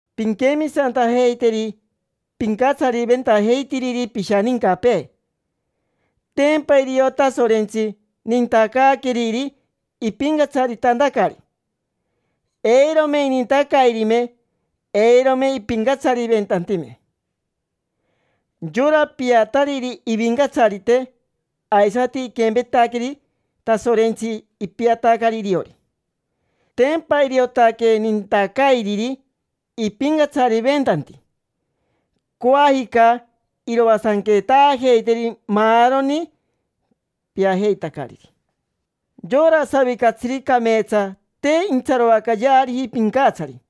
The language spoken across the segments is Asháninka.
Pinquemisantajeiteri pincatsariventajeitiriri pishanincapee: tempa irio Tasorentsi nintacaaqueriri ipincatsaritantacari. Eirome inintacairime, eirome ipincatsariventantime. Yora piatariri ivincatsarite, aisati iquempetaqueri Tasorentsi, ipiatacari iriori. Tempa iriotaque nintacairiri ipincatsariventanti. Coajica iroasanquetaajeiteri maaroni piajeitacariri. Yora savicatsiri cameetsa te intsaroacayeariji pincatsari,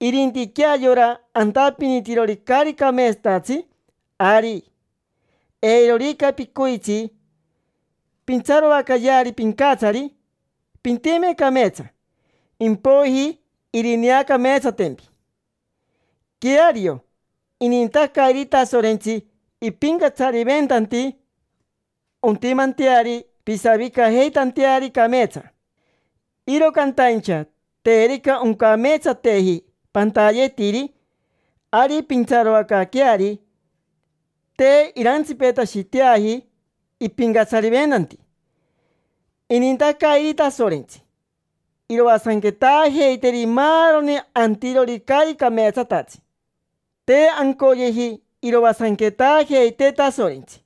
irintiquea yora antapinitirori caari cameetsatatsi. Ari, eirorica picoitsi pintsaroacayeari pincatsari, pintime cameetsa; impoiji irineacameetsatempi. Queario, inintacairi Tasorentsi ipincatsariventanti ontimanteari pisavicajeitanteari cameetsa. Iro cantaincha terica oncameetsateji pantayetiri, ari pintsaroacaaqueari. Te irantsipetashiteaji ipincatsariventanti. Inintacairi Tasorentsi iroasanquetaajeiteri maaroni antirori caari cameetsatatsi. Te ancoyeji iroasanquetaajeitee Tasorentsi,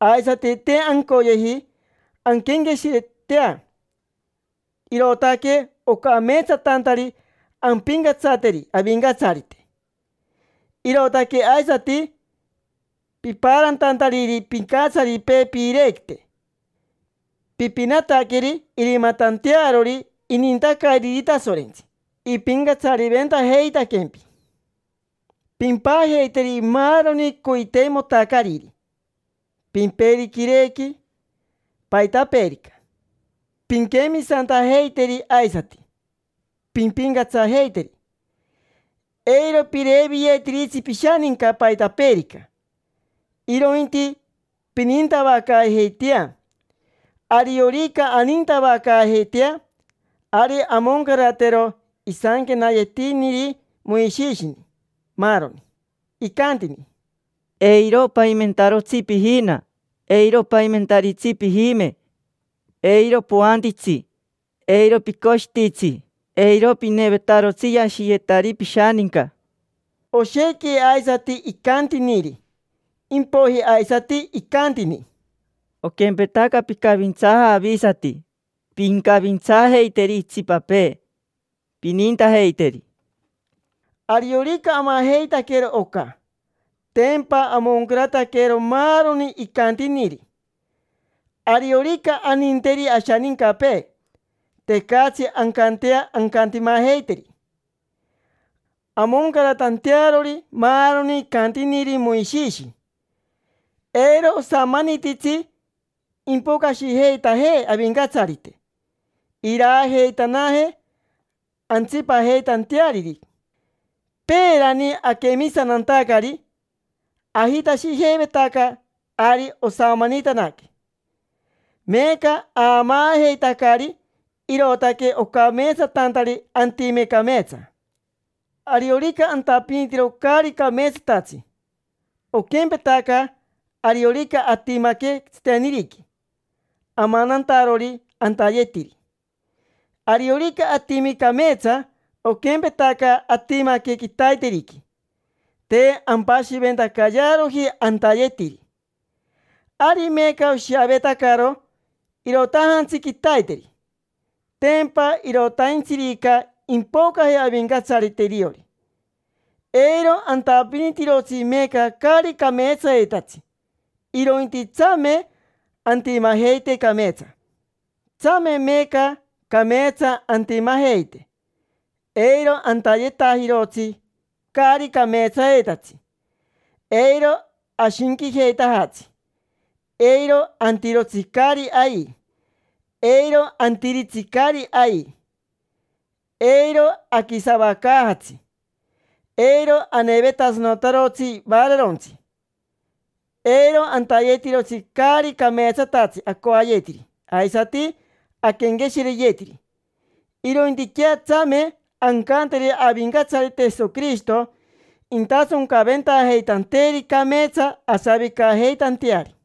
aisati te ancoyeji anquenqueshiretea, irootaque ocameetsatantari ampincatsateri avincatsarite. Irootaque aisati pipaarantantariri pincatsaripee piirequite. Pipinataqueri irimatantearori inintacairiri Tasorentsi: ipincatsariventajeitaquempi. Pimpajeiteri maaroni coiteimotacariri: pimperi quirequi, paitapeerica. Pinquemisantajeiteri aisati pimpincatsajeiteri. Eiro pireviyetiritsi pishaninca paitapeerica, irointi pinintavacaajeitea. Ariorica anintavacaajeitea, ari amoncaratero isanquenayetiniri Moishishini, maaroni. Icantini: “Eiro paimentarotsi pijina, eiro paimentaritsi pijime, eiro poantitsi, eiro picoshititsi, eiro pinevetarotsi yashiyetari pishaninca”. Oshequi aisati icantiniri. Impoiji aisati icantini: “Oquempetaca picavintsaaja avisati, pincavintsaajeiteri itsipapee, pinintajeiteri”. Ariorica amajeitaquero oca, tempa amoncarataquero maaroni icantiniri. Ariorica aninteri ashanincapee, tecatsi ancantea ancantimajeiteri, amoncaratantearori maaroni icantiniri Moishishi. Eiro osamanititsi impocashijeitajee Avincatsarite iraajeitanajee antsipajeitanteariri. Peerani aquemisantantacari, ajitashijeivetaca ari osamanitanaque. Meeca aamaajeitacari, irootaque ocameetsatantari antime cameetsa. Ariorica antapinitiro caari cameetsatatsi, oquempetaca ariorica atimaque tsiteniriqui, amanantarori antayetiri. Ariorica atimi cameetsa, oquempetaca atimaque quitaiteriqui, te ampashiventacayearoji antayetiri. Ari meeca oshiavetacaro irootajantsi quitaiteri, tempa irotaintsirica impocaje Avincatsarite iriori. Eiro antapinitirotsi meeca caari cameetsayetatsi, irointi tsame antimajeite cameetsa. Tsame meeca cameetsa antimajeite. Eiro antayetajirotsi caari cameetsayetatsi, eiro ashinquijeitajatsi, eiro antirotsi caari ai, eiro antiritsi caari ai, eiro aquisavacaajatsi, eiro anevetasanotarotsi vaararontsi, eiro antayetirotsi caari cameetsatatsi acoayetiri aisati aquenqueshireyetiri. Irointiquea tsame ancanteri Avincatsarite Jesoquirishito intasoncaventajeitanteeri cameetsa asavicajeitanteari.